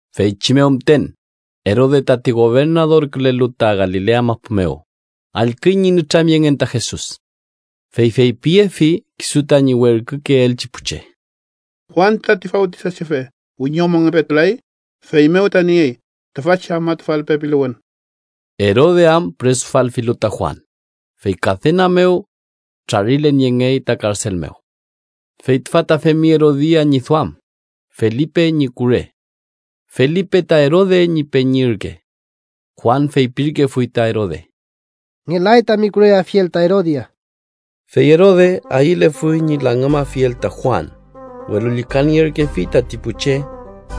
Feychi mew müten, Erode, tati gobernadorkülelu ta Galilea mapu mew, allküy ñi nütramyengen ta Jesus. Fey feypiyefi kisu tañi werkükeelchi pu che: “Juan tati Fawtisachefe wiñomongepetulay. Feymew ta niey tüfachi afmatufal pepiluwün.” Erode am püresufalfilu ta Juan, fey kadena mew trarilen yengey ta karsel mew. Fey tüfa ta femfi Erodia ñi duam, Felipe ñi kure. (Felipe ta Erode ñi peñi ürke.) Juan feypirkefuy ta Erode: “Ngelay tami kureyeafiel ta Erodia.” Fey Erode ayülefuy ñi langümafiel ta Juan, welu llükanierkefi tati pu che,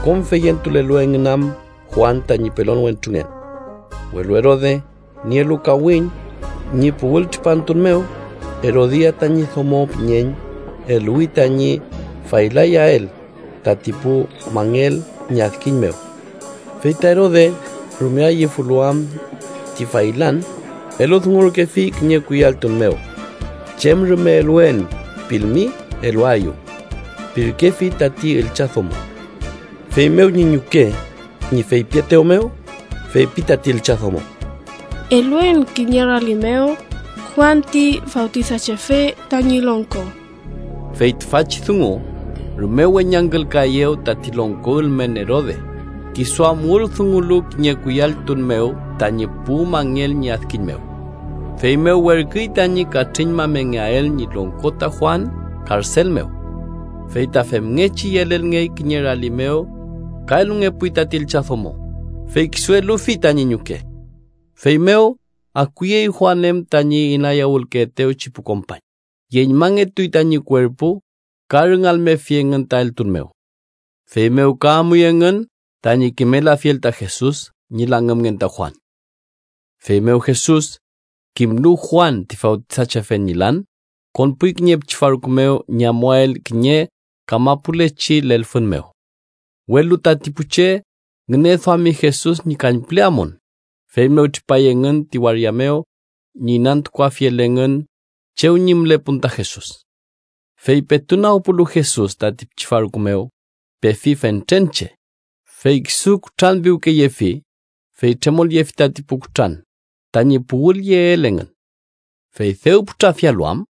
kom feyentulelu engün am Juan tañi pelon wentrungen. Welu Erode nielu kawiñ ñi puwültripantun mew, Erodia tañi domo püñeñ eluwi tañi faylayael tati pu mangel ñi adkiñ mew. Fey ta Erode rume ayüfilu am ti faylan, eludungurkefi kiñe kuyalltun mew: “chem rume eluen pilmi eluaeyu” pirkefi tati üllchadomo. Feymew ñi ñuke ñi feypietew mew, feypi tati üllchadomo: —Eluen kiñe rali mew Juan ti Fawtisachefe tañi longko. Fey tüfachi dungu rume weñangkülkaeyew tati longko ülmen Erode, kisu am wüldungulu kiñe kuyalltun mew tañi pu mangel ñi adkiñ mew. Feymew werküy tañi katrüñmamengeael ñi longko ta Juan karsel mew. Fey ta famngechi yelelngey kiñe rali mew ka elungepuy tati üllchadomo, fey kisu elufi tañi ñuke. Feymew akuyey Juan em tañi inayawülkefetewchi pu kompañ, yeñmangetuy tañi kuerpu ka rüngalmefi engün ta eltun mew. Feymew ka amuy engün tañi kimelafiel ta Jesus ñi langümngen ta Juan. Feymew Jesus kimlu Juan ti Fawtisachefe ñi lan, konpuy kiñe pichi farku mew ñi amuael kiñe kamapulechi lelfün mew. Welu tati pu che ngüneduami Jesus ñi kañpüle amun, feymew tripay engün ti waria mew ñi inantukuafiel engün chew ñi mülepun ta Jesus. Fey petu nagpulu Jesus tati pichi farku mew, pefi fentren che, fey kisu kutranpiwkeyefi, fey tremolyefi tati pu kutran tañi puwülyeel engün. Fey dew putrafialu am,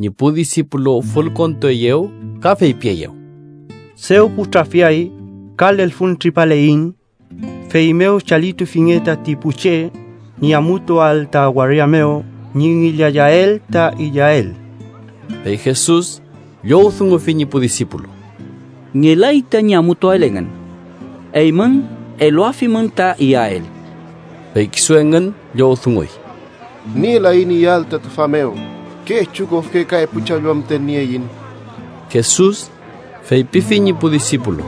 ñi pu disipulu fülkontueyew ka feypieyew: —Dew putrafiay, ka lelfüntripaleiñ. Feymew chalitufinge tati pu che, ñi amutuael ta waria mew ñi ngillayael ta iyael. Fey Jesus llowdungufi ñi pu disipulu: —Ngelay tañi amutuael engün. Eymün eluafimün ta iyael. Fey kisu engün llowdunguy: —Nielaiñ iyael ta tüfa mew. Kechu kofke ka epu challwa müten nieiñ. Jesus feypifi ñi pu disipulu: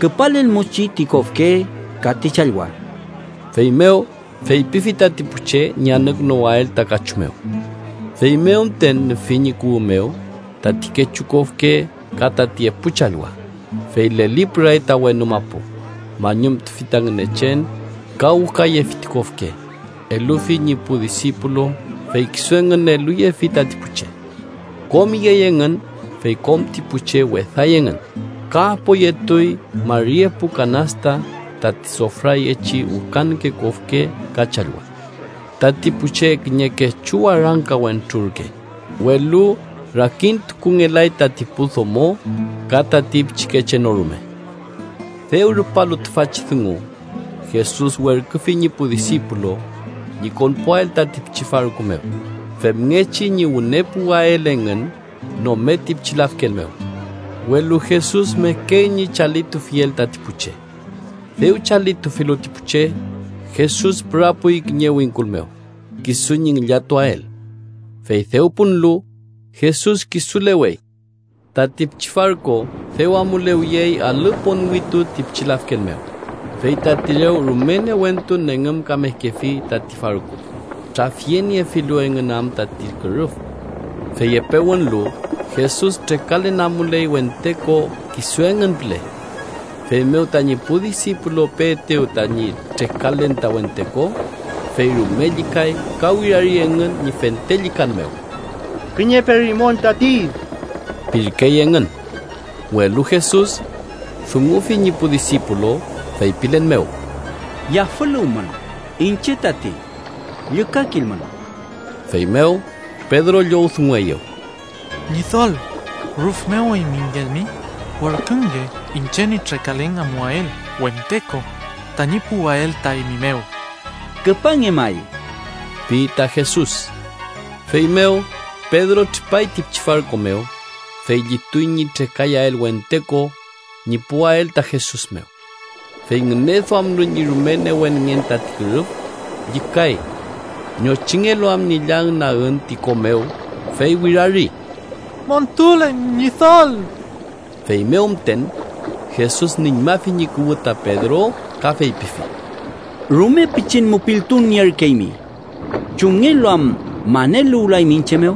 —Küpalelmuchi ti kofke ka ti challwa. Feymew feypifi tati pu che ñi anükünuwael ta kachu mew. Feymew müten nüfi ñi kuwü mew tati kechu kofke ka tati epu challwa, fey lelipüray ta wenu mapu, mañumtufi ta Ngünechen ka wükayefi ti kofke, elufi ñi pu disipulu, fey kisu engün eluyefi tati pu che. Kom iyey engün fey kom ti pu che weday engün, ka apoyetuy mari epu kanasta tati sofrayechi wükanke kofke ka challwa. Tati pu che kiñe kechu warangka wentru ürke, welu rakintukungelay tati pu domo ka tati pichikeche no rume. Dew rupalu tüfachi dungu, Jesus werküfi ñi pu disipulu ñi konpuael tati pichi farku mew, femngechi ñi wüne puwael engün nome ti pichi lafken mew. Welu Jesus mekey ñi chalitufiel tati pu che. Dew chalitufilu ti pu che, Jesus pürapuy kiñe wingkul mew, kisu ñi ngillatuael. Fey dew punlu, Jesus kisulewey. Tati pichi farku dew amulewiyey alü ponwitu ti pichi lafken mew, fey tati rew rume newentu nengümkamekefi tati farku, trafyeniefilu engün am tati kürüf. Fey epe wünlu, Jesus trekalen amuley wente ko kisu engün püle. Feymew tañi pu disipulu peetew tañi trekalen ta wente ko, fey rume llükay, ka wirari engün ñi fente llükan mew: —¡Kiñe perimon tati! ―pirkey engün. Welu Jesus dungufi ñi pu disipulu, feypilen mew: —¡Yafüluwmün! ¡Iñche tati! ¡Llükakilmün! Feymew Pedro llowdungueyew: —Ñidol, rüf mew eymingelmi, werkünge iñche ñi trekalen amuael wente ko tañi puwael ta eymi mew. —Küpange may ―pi ta Jesus. Feymew Pedro tripay ti pichi farku mew, fey llituy ñi trekayael wente ko ñi puwael ta Jesus mew. Fey ngüneduamlu ñi rume newenngen tati kürüf, llükay. Ñochingelu am ñi llañnagün ti ko mew, fey wirari: —¡Montulen Ñidol! Feymew müten, Jesus nüñmafi ñi kuwü ta Pedro ka feypifi: —¡Rume pichin mupiltun nierkeymi! ¿Chumngelu am maneluwlaymi iñche mew?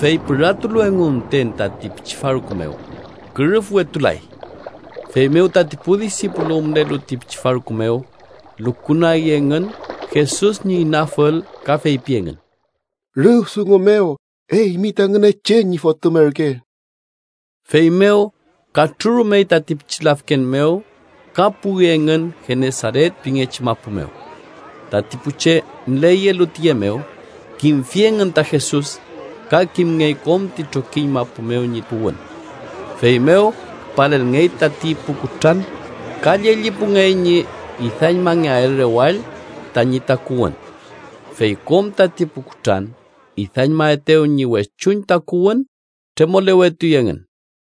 Fey püratulu engu müten tati pichi farku mew, kürüfwetulay. Feymew tati pu disipulu mülelu ti pichi farku mew, lukunagi engün Jesus ñi inafül ka feypi engün: —¡Rüf dungu mew eymi ta Ngünechen ñi Fotüm ürke! Feymew katrürumey tati pichi lafken mew ka puwi engün Genesaret pingechi mapu mew. Tati pu che müleyelu tiye mew, kimtufi engün ta Jesus, ka kimngey kom ti trokiñ mapu mew ñi puwün. Feymew küpalelngey tati pu kutran, ka llellipungey ñi idañmangeael rewall tañi takuwün. Fey kom tati pu kutran idañmaetew ñi wechuñ takuwün, tremolewetuy engün.